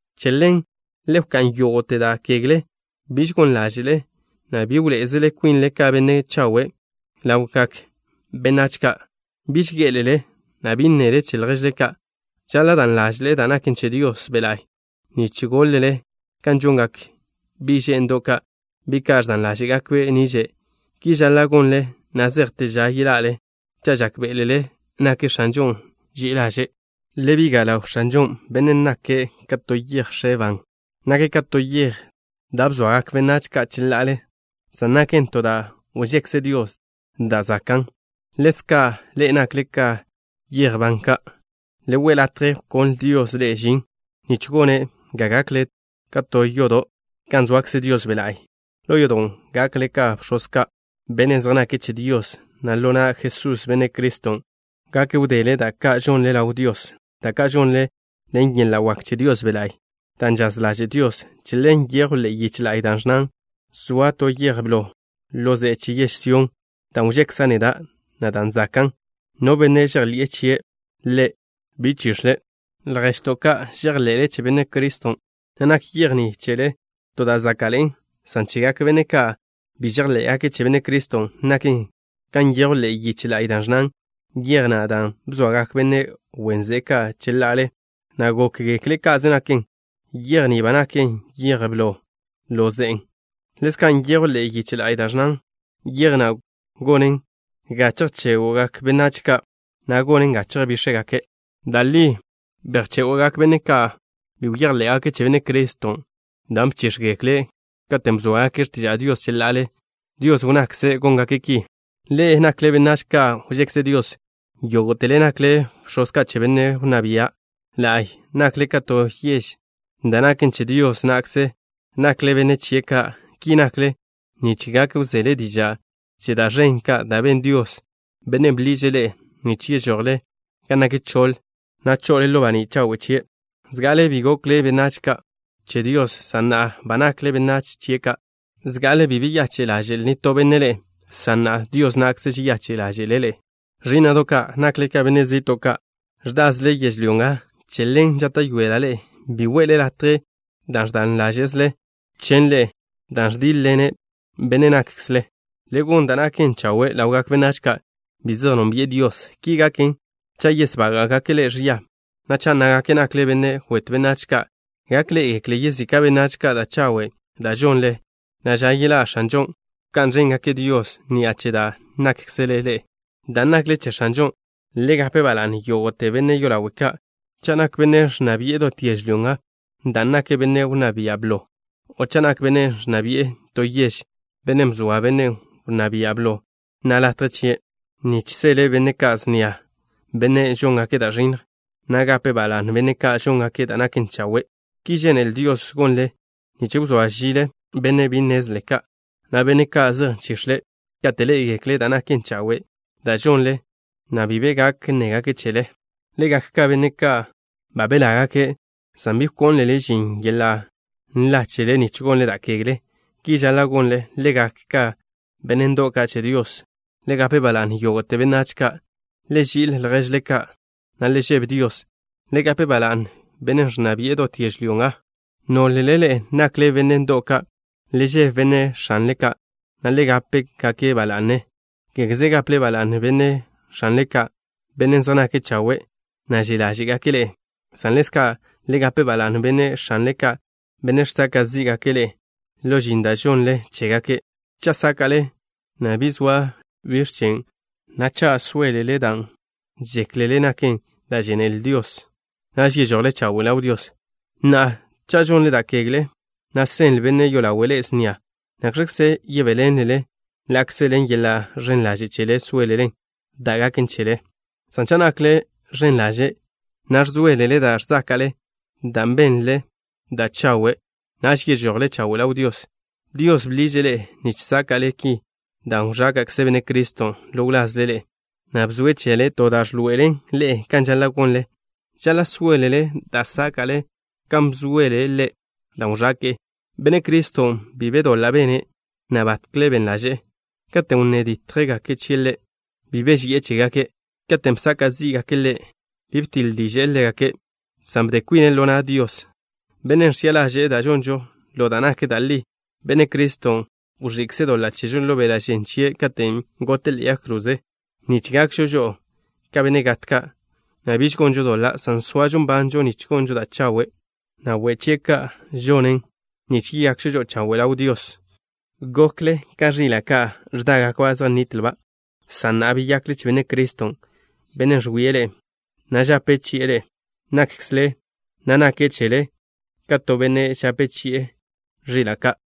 Che ḻen le wká'n yógo'te da' kegle. Biž gon ḻáže'le, na' bi wḻoé'ezele kwinle ka benne' chawe' ka' ḻawgak benách ka'. Biž gé'elele, na' bi nnele che lježle ka'. Žaḻa' dan ḻáže'le da' naken che Dios Be' La'y nich gólele kan žongak bi' že'ndo' ka', bi' ka' ẕdan ḻáže'gakbe' niže'. Ki žaḻa' gonle na' zejte ža yelale, cha' žákbe'elele nak X̱anžon' ži'i ḻaže'. Le biga' ḻaw X̱anžon', Bennen' nake' ka to yej x̱e ban. Nake' ka to yej da' bzoagak benách ka' cheḻa'ale, san naken to da' wžekze Dios da' zakan'. Ḻezka', ḻe'e nakle ka yej ban ka'. Le we' latje wkonle Dios ḻe'e žin, nich gone' ga gakle ka to yodo' gan soakze Dios Be' La'y. Ḻo yodon' gakle ka bx̱oz ka', benne' zej nake' che Dios, na' ḻo na' Jesús, Benne' Criston', gak wdele da' ka' žonle ḻaw Dios, da' ka' žonle ḻen yeḻa' wak che Dios Be' La'y, dan' žaz ḻaže' Dios. Che ḻen nyejw ḻe'e yiche la'y da' ẕnnan: Ẕgo'a to yej blo ḻo ze'e che yež Sión, dan' wžekza' neda', na' dan' zakan'. No benne' žejḻi'e chie' Ḻe', bi chix̱le'. Lježto' ka', žejḻe'le che Benne' Criston', na' nak yej ni chele to da' záka'ḻe'en, san chegak benne' ka' bi žejḻé'gake' che Benne' Criston', naken kan nyejw ḻe'e yiche la'y, da' ẕnnan: Yej na' dan' bzoagak benne' wen ze'e ka' cheḻa'ale, na' gókgekle' ka'ze naken, yej ni ba naken yej blo ḻo ze'e. Ḻezka' nyejw ḻe'e yiche la'y da' ẕnnan: Yej na' gonen ga chejchégwgak benách ka', na' gonen ga chejbíx̱jgake'. Da' li bejchégo'gak benne' ka' bi bejḻé'gake' che Benne' Criston', dan' bchíx̱gekle' katen' bzóagake' x̱tiža' Dios cheḻa'ale. Dios wnnakze' góngake' ki. Ḻe'e nakle benách ka' wžekze Dios. Yógo'tele nakle bx̱oz ka' che Benne' Wnná Bia' La'y. Nakle ka to yež da' naken che Dios na'kze. Nakle benne' chie' ka'. Ki nakle nich gak wzele diža' che da' ẕen ka' da' ben Dios, Bennen' bḻiže' ḻe'e nich yežojle gan nak choḻ, na' chazle ḻo baní' chawe' chie'. Zga'ale bi gokle benách ka' che Dios, san na'a ba nakle benách chie' ka'. Zga'ale bi beyache' ḻaže'l nitó benne' ḻe'e, san na'a Dios na'kze žeyache' ḻáže'le' ḻe'e. Ẕí'na'do' ka', nakle ka benne' zi'to' ka', ẕdázele yežlyó nga. Che ḻen, žáta'yoela' ḻe'e, bi we'le latje da' ẕdan ḻáže'zele chen' ḻe'e, dan' ẕdíḻ-ḻenen be' nákkzele. Le gon da' naken chawe' ḻawgak benách ka' bi zej nónbi'e Dios. Ki gaken, cha' yesbága'gake' ḻe'e ẕia, na' cha' nnágake' nakle benne' wetw benách ka', gak ḻé'egekle yezika' benách ka' da' chawe' da' žonle, na' ža yeḻá' X̱anžon' wká'n ẕéngake' Dios ni'a che da' nákkzele ḻe'e. Dan' nakle che X̱anžon' le gape ba la'ne yógo'te benne' yolawe' ka', cha' nak benne' ẕnna bi'e dot yežlyó nga, dan' nake' benne' wnná bia' blo, o cha' nak benne' ẕnna bi'e to yež, bennen' bzoa benne' wnná bia' blo na' latje chie' nich seḻe' benne' ka' snia, benne' žóngake' da' ẕinnj, na' gape' ba la'ne benne' ka' žóngake' da' naken chawe'. Ki žénele Dios gonle nich wzóa žile benne' bi nnezle ka', na' benne' ka' zej nchix̱le', kate' ḻé'egekle' da' naken chawe' da' žonle, na' bi be gak nnégake' chele. Le gak ka benne' ka' ba belágake', san bi wkónlele žin yeḻa' nla chele nich gonle da' kegle. Ki žaḻa' gonle: Le gak ka benne' ndo'w ka' che Dios. Le gape ba la'ne yógo'te benách ka'. Le ži'il lježle ka', na' le žebe Dios. Le gape ba la'ne bennen' ẕnna bi'e dot yežlyó nga. Nólele ḻe'e nakle benne' ndo'w ka', le žebe benne' x̱anle ka', na' le gape-gake' ba la'ne, kégeze gaple ba la'ne benne' x̱anle ka', benne' zej nake' chawe', na' že' ḻáže'gake' ḻe'e, san ḻezka' le gape ba la'ne benne' x̱anle ka', benne' žsaka' zí'gake' ḻe'e ḻo žin da' žonle chégake'. Cha' sáka'le, na' bi zoa biẕ chen', na' cha' sóelelen dan' žéklele naken da' žénele Dios, naž yežojle chawe' ḻaw Dios. Na'a, cha' žonle da' kegle, na' seḻ benne' yolawe' ḻe'e snia, ¿nakx̱kze yebéḻenlelen ḻa'kze ḻen yeḻa' ẕen ḻaže' chele sóelele dan' gaken chele? San cha' nakle ẕen ḻaže', na' ẕzóelele da' ẕzáka'le, dan' benle da' chawe', naž yežojle chawe' ḻaw Dios. Dios bḻiže' ḻe'e nich sáka'le ki dan' wẕáka'kze Benne' Criston' ḻo wlazle ḻe'e, na' bzoe' chele to da' ẕḻoe'elen ḻe'e kan žaḻa' gonle. Žaḻa' sóelele da' sáka'le kan bzoele' Ḻe' dan' wẕake'e. Benne' Criston' bi be doḻa' bene', na' batkle ben ḻaže'e. Katen' wnné dítjgake' chie' Ḻe', bi beži'e chégake'. Katen' bsaka' zí'gake' Ḻe', bi btiḻ diže'e ḻégake', san bde kwine' ḻo na' Dios, Bennen' ẕchi'a ḻaže'e da' žonžo ḻo da' nak da' li. Benne' Criston' wẕi'kze' doḻa' chežo ḻo beḻa' žen chie' katen' gote' ḻe'e yag kroze, nich gakžo žo'o ka benne' gat ka', na' biž gonžo doḻa', san soažo nbanžo nich gonžo da' chawe'. Ḻe' goke' yižwé' ḻo wlazžo žo'o nich yeyakžo žo'o chawe' ḻaw Dios. Gokle ka ẕila' ka' ẕdágakba' zej nnitlba', san na'a beyakle che Benne' Criston', Bennen' ẕwie' ḻe'e, na' žape chi'e be' nákkzele, na' nake' chele ka to benne' žape chi'e ẕila' ka'.